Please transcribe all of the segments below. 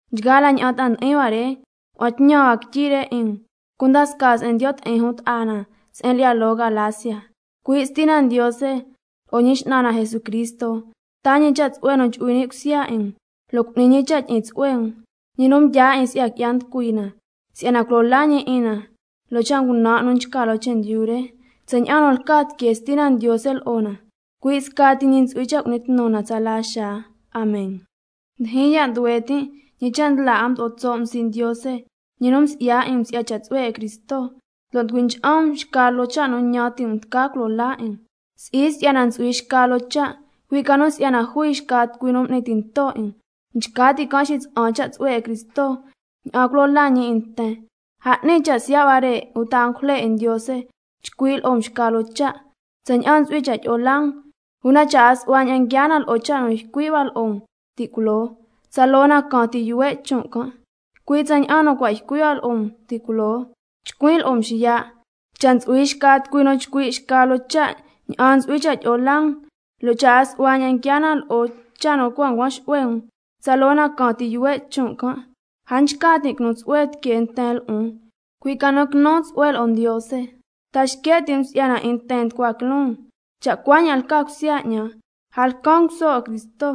A cunta nchgaa la ña'an ta'a ndi'in hua re ngua'an tñan hua quityi re 'in um, cunda scaa se'en ndiyo' ti'in jun ta'a na se'en lyi'ya loo Galacia. Cui' Stina Ndiose lo'o Ñi X'nan na Jesucristo taa ñi cha' tsu'hue nu chu'hui ni' cusya 'in um, lo' cu'ni ñi cha' tyi'in tsu'hue um, ñi nu mdyaa 'in si'ya qui'ya nducui na, si'yana culo laa ñi 'in na loo cha' ngunan' nu nchca loo chendyu re, tsaña'an nu lca tiquee Stina Ndiose lo'o na, cui' scati ñi ntsu'hui cha' cu'ni tnu na tsala xaa. Amen. Ndyijyin ya' nduhue tin' ñi cha' ndla 'a mdo'o tso' um sii' Ndiose, ñi nu msi'ya 'in um si'ya cha' tsu'hue 'in Cristo, lo' nducui ncha'an um xca loo cha' nu ñan ti' um tca culo laa 'in um. Si'i si'yana ntsu'hui xca loo cha', cui' ca nu si'yana jui xca tucui nu m'ni tinto 'in um, nchca ti' can' xitsa'an ña'an ntsu'hui cha' tyi'o laa nten si'ya Cristo. A 'ni cha' siya' huare' uta angujle 'in Ndiose, cha' chcui' hua lo'o um xca loo cha' tsaña'an ntsu'hui cha' tyi'o laa um, una cha' a su'hua ña'an nguiaa na lo'o cha' nu ycui' hua lo'o um ti' culoo, tsaloo na caan ti yuhue' chon' hua. Cui' tsaña'an nu cua' ycui' hua lo'o um ti' culoo, nchcuin' lo'o um xiya': Cha' ntsu'hui xca tucui nu chcui' xca loo cha' tsaña'an ntsu'hui cha' tyi'o laa um, lo' cha' a su'hua ña'an nguiaa na lo'o cha' nu cua' ncuan xu'hue um, tsaloo na caan ti yuhue' chon' can'. ¿Ta ñan ti' um si'yana nchca tin' quinu tsu'hue tiquee nten lo'on, uta si'yana quinu tsu'hue tiquee Ndiose lo'on? ¿Ta xque' ti' um si'yana 'in nten nducua quiloon? Cha' cuaña'an lca cusya 'ñan, a lcan nguso 'in Cristo.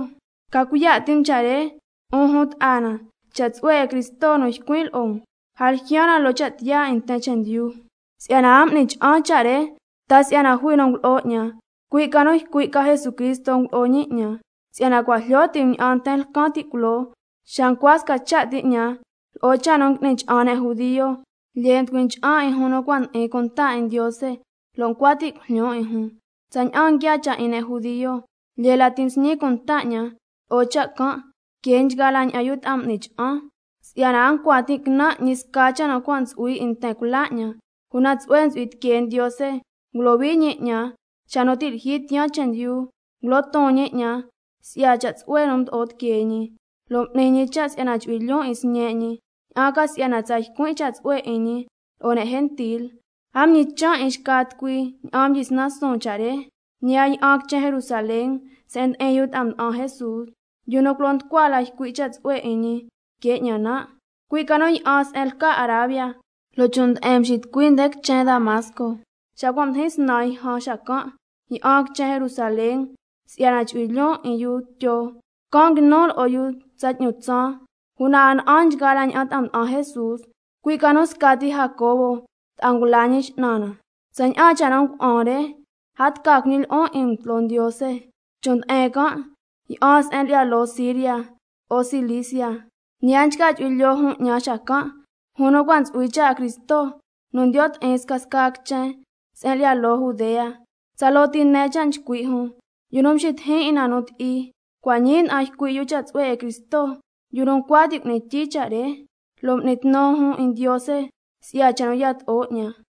Ca cuiya' ti' um cha' re, 'un jun ta'a na, cha' tsu'hue 'in Cristo nu ycuin' lo'o um, a ljyaan na loo cha' tiyaa 'in nten chendyu, si'yana a m'ni cha'an cha' re ta si'yana jui nu ngulo'o 'ñan, cui' ca nu ycui' ca Jesucristo ngulo'o ñi 'ñan. Si'yana cua' jlyo ti' um ña'an nten lcan ti' culoo xa ncua sca cha' ti 'ñan lo'o cha' nu ngui'ni cha'an ne' judio, lyee mducui ncha'an 'in jun nu cua' ndi'in cunta 'in Ndiose, lo' ncua tin' cujlyon 'in jun siya' ti. Tsaña'an nguiaa cha' 'in ne' judio, lyee lati msñi cunta 'ñan lo'o cha' can' que nchgaa la ña'an yu ta'a m'ni cha'an, si'yana a ncua tin' quinan' ñi sca cha' nu cua' ntsu'hui 'in nten cula 'ñan. Una Ndiose tsu'hue ntsu'hui tiquee ñi ngulohui ñi 'ñan xa nu ti' lyijyi tiyaan chendyu, ngulo ton ñi 'ñan si'ya cha' tsu'hue nu mdo'o tiquee ñi, lo' m'ni ñi cha' si'yana chu'hui lyoon 'in Sñe' ñi, ña'an ca si'yana tsa ycuin' cha' tsu'hue 'in ñi lo'o ne' gentil. A mñichan' 'in xca tucui ña'an mdyisnan suun cha' re, ñi a yi'an quichen Jerusalén se'en ndi'in yu ta'a mda'an Jesús, yu nu culo nducua la ycui' cha' tsu'hue 'in ñi que 'ñan nan', cui' ca nu yi'an se'en lca Arabia, la chon' nde'en mxitucuin nde quichen Damasco. Xa cua' mdijin snan yjan, xacan' yi'an quichen Jerusalén si'yana chu'hui lyoon 'in yu Tyo, can' nguinun lo'o yu tsa 'tñu tsaan. Una a na'an nchgaa la ña'an ta'a mda'an Jesús, cui' ca nu scati Jacobo ta'a ngula Ñi X'nan na. Tsaña'an cha' nu ngua'an re, a tca cuiñi lyi'on 'in um tloo Ndiose. Chon' nde'en can' yi'an se'en lyi'ya loo Siria lo'o Cilicia. Ñi a nchca chu'hui lyoo jun 'ñan xacan', jun nu cua' ntsu'hui cha' 'in Cristo nu ndiyo' ti'in scasca quichen se'en lyi'ya loo Judea. Tsaloo ti nen cha' nchcui' jun: Yu nu mducui ncha'an 'in na ti' culoo, cua' ñii nda'an ycui' yu cha' tsu'hue 'in Cristo, yu nu ncua ti' cu'ni tyii cha' re. Lo' m'ni tnu jun 'in Ndiose si'ya cha' nu yato'o 'ñan.